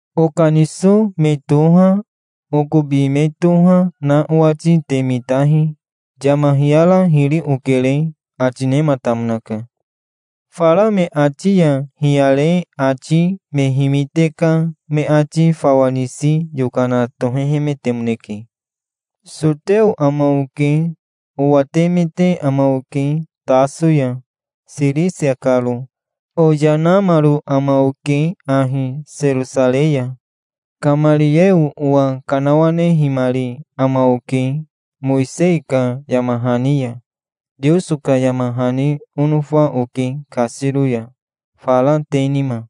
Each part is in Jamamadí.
"Okaniso me toha, okobi me toha na owati te mitahi. Yama hiyara hiri okere", ati nematamonaka. Fara me ati ya hiyare ati me himite ka me ati fawa nisi yokana tohehemetemoneke. "Soteo ama oke. Owatemete ama oke Taso ya, Sirisia karo. Oyanamaro ama oke ahi Serosarei ya. Kamarieo owa kanawanehimari ama oke, Mowisei ka yama hani ya. Teoso ka yama hani onofa oke kasiro ya, fara te nima.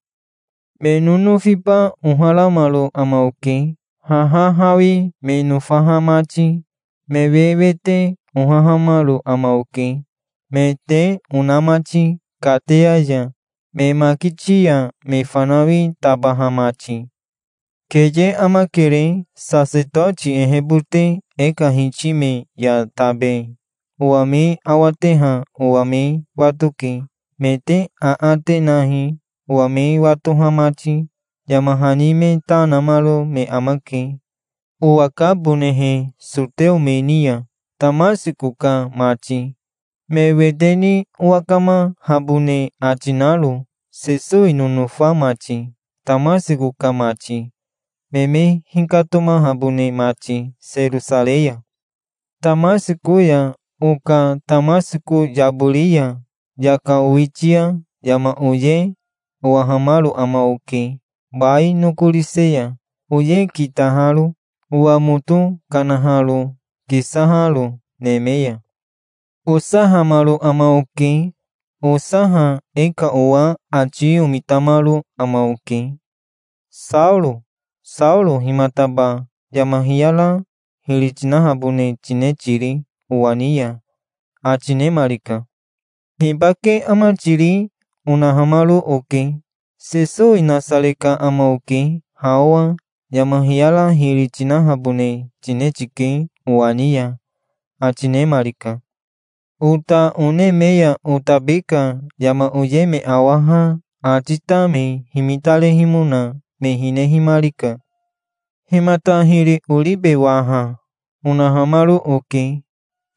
Me nonofiba oharamaro ama oke, haha hawi me nofaha mati. Me wewete ohahamaro ama oke, me te ona mati kateya ya, me makiti ya me fanawi tabaha mati. Keye amakere. Sasetoti ehebote e ka hiti me ya tabe owa me awateha owa me watoke. Me te aate nahi, owa me watoha mati. Yama hani me ta namaro me amake, owakabonehe soteo me ni ya, Tamasiko ka mati, me wete ni owakamahabone ati naro, Sesowi nonofa mati, Tamasiko ka mati, me me hikatomahabone mati Serosarei ya". "Tamasiko ya oka Tamasiko yabori ya yaka owitia yama oye owahamaro ama oke bai nokorise ya, oye kitaharo, owa moto kanaharo, kisaharo neme ya. Osahamaro ama oke. Osaha e ka owa ati omitamaro ama oke. 'Saoro, Saoro, himataba yama hiyara hiri tinahabone tine tiri owa ni ya?' ati nemarika". "'Hibake ama tiri?' onahamaro oke". "'Sesowi Nasare ka ama oke. Ha owa yama hiyara hiri tinahabone tine tike owa ni ya', ati nemarika. Ota one me ya otabi ka yama oye me awaha ati ta me himitarehimona me hinehimarika". "'Himata hiri oribe waha?' onahamaro oke".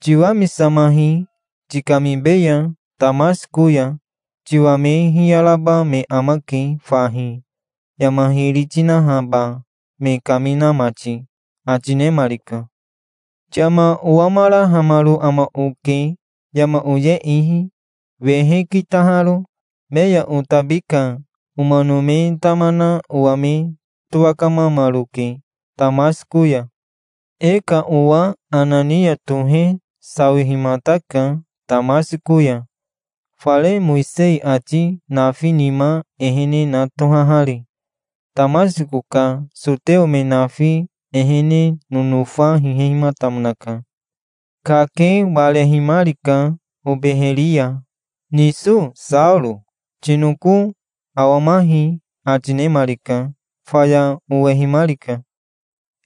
"'Tiwamisamahi. Tikamibeya Tamasiko ya. Tiwa me hiyaraba me amake fahi, yama hiri tinahaba me kamina mati', ati nemarika". "Yama owamarahamaro ama oke, yama oye ihi, wehe kitaharo. Me ya otabi ka omano me tama na owa me towakamamaroke Tamasiko ya". "E ka owa Anania tohe sawihimataka Tamasiko ya, fare Mowisei ati nafi nima ehene na tohahari. Tamasiko ka soteo me nafi ehene nonofa hihehimatamonaka. Kake warehimarika obeheri ya. 'Niso Saoro, tinoko awamahi', ati nemarika. Faya owehimarika.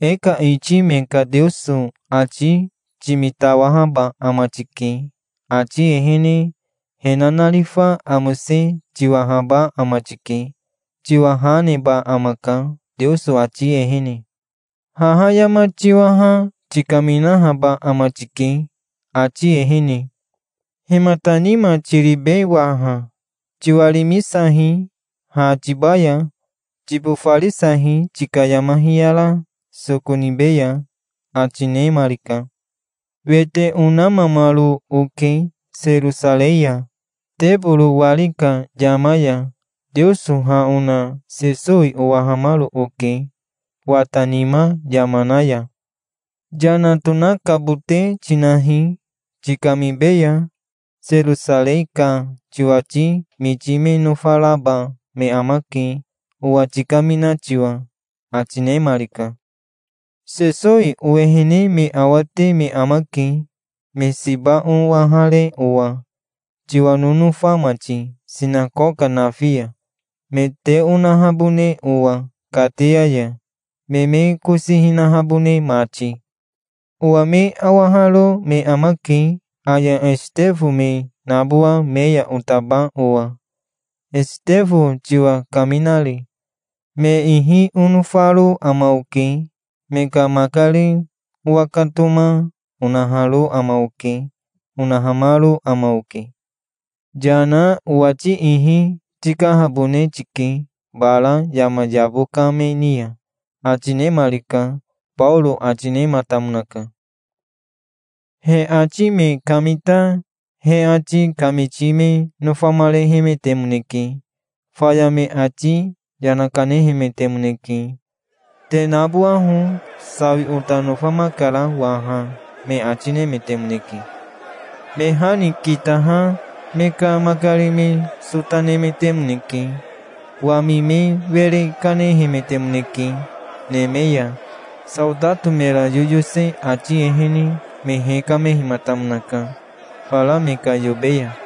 'E ka iti me ka Teoso ati timitawahaba ama tike. Ati ehene he nanarifa amose tiwahaba ama tike. Tiwa ha neba amaka Teoso ati ehene. Haha yama tiwaha tikaminahaba ama tike, ati ehene. Himata nima tiribe waha? Tiwarimisahi, ha tibaya. Tibofarisahi, tika yama hiyara soko nibeya', ati nemarika". "Wete onamamaro oke Serosarei ya. Teboro wari ka yama ya Teoso ha ona Sesowi owahamaro oke wata nima yama na ya. 'Yana tonakabote tinahi, tikamibeya. Serosarei ka tiwati miti me nofaraba me amake, owa tikamina tiwa', ati nemarika". "'Sesowi owehene me awate me amake, me siba owahare owa, tiwa nonofa mati, sinakoka nafi ya, me te onahabone owa kateya ya, me me kosi hinahabone mati. Owa me awaharo me amake aya Esitefo me nabowa me ya otaba owa, Esitefo tiwa kaminari. Me ihi onofaro ama oke. Me ka makari owakatoma onaharo ama oke', onahamaro ama oke". "'Yana. Owati ihi tikahabone tike bara yama yabo ka me ni ya', ati nemarika", Baoro ati nematamonaka. He ati me kamita he ati kamiti me nofamarehemetemoneke. Faya me ati yana kanehemetemoneke. "Te nabowaho. Sawi ota nofamakara waha", me ati nemetemoneke. Me ha ni kitaha me ka makari me sota nemetemoneke. Wami me were kanehemetemoneke neme ya. Saotato mera yoyose ati ehene me hekamehimatamonaka fara me ka yobe ya.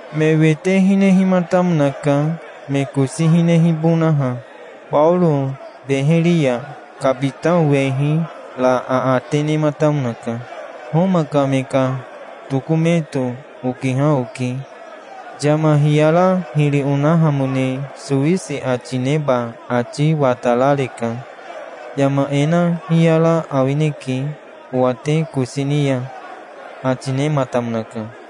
Me wete hinehimatamonaka, me kosi hinehibonaha. Baoro beheri ya kabitao wehi ra aate nematamonaka. "Homa ka me ka tokometo okiha oke. Yama hiyara hiri onahamone sowisi ati neba ati watarareka. Yama e na hiyara awineke, owa te kosi ni ya", ati nematamonaka.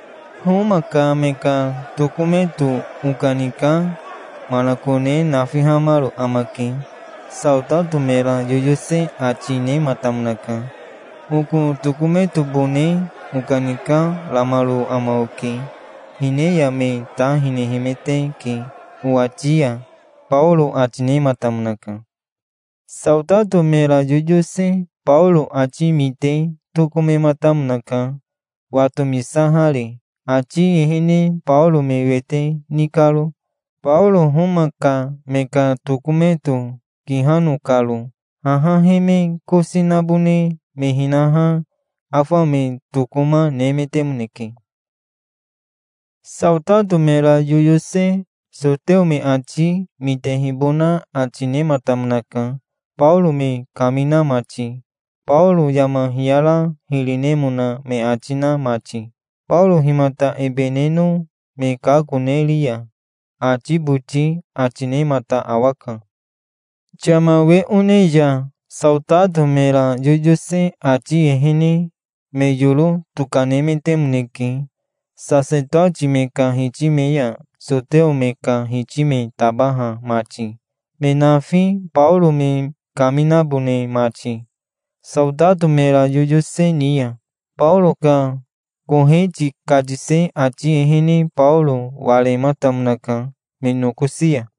"Homa ka me ka tokometo okanika manakone nafihamaro amake", saotato mera yoyose ati nematamonaka. "Oko tokometobone okanikaramaro amake. Hine ya me ta hinehemeteke owati ya", Baoro ati nematamonaka. Saotato mera yoyose Baoro ati mite tokomematamonaka, watomisahari, ati ehene Baoro me wete ni karo, Baoro Homa ka me ka tokometo kihano karo. Haha he me kosi nabone me hinaha, afa me tokoma, nemetemoneke. Saotato mera yoyose soteo me ati mitehibona ati nematamonaka, Baoro me kamina mati, Baoro yama hiyara hiri nemona me ati na mati. "Baoro himata ebe neno me kakoneriya?" ati boti ati nemata awaka. Yama we one ya saotato mera yoyose ati ehene me yoro tokanemetemoneke, sasetoti me ka hiti me ya soteo me ka hiti me tabaha mati, me nafi, Baoro me kaminabone mati, Saotato mera yoyose ni ya. Baoro ka koheti katise ati ehene Baoro warematamonaka me nokosi ya.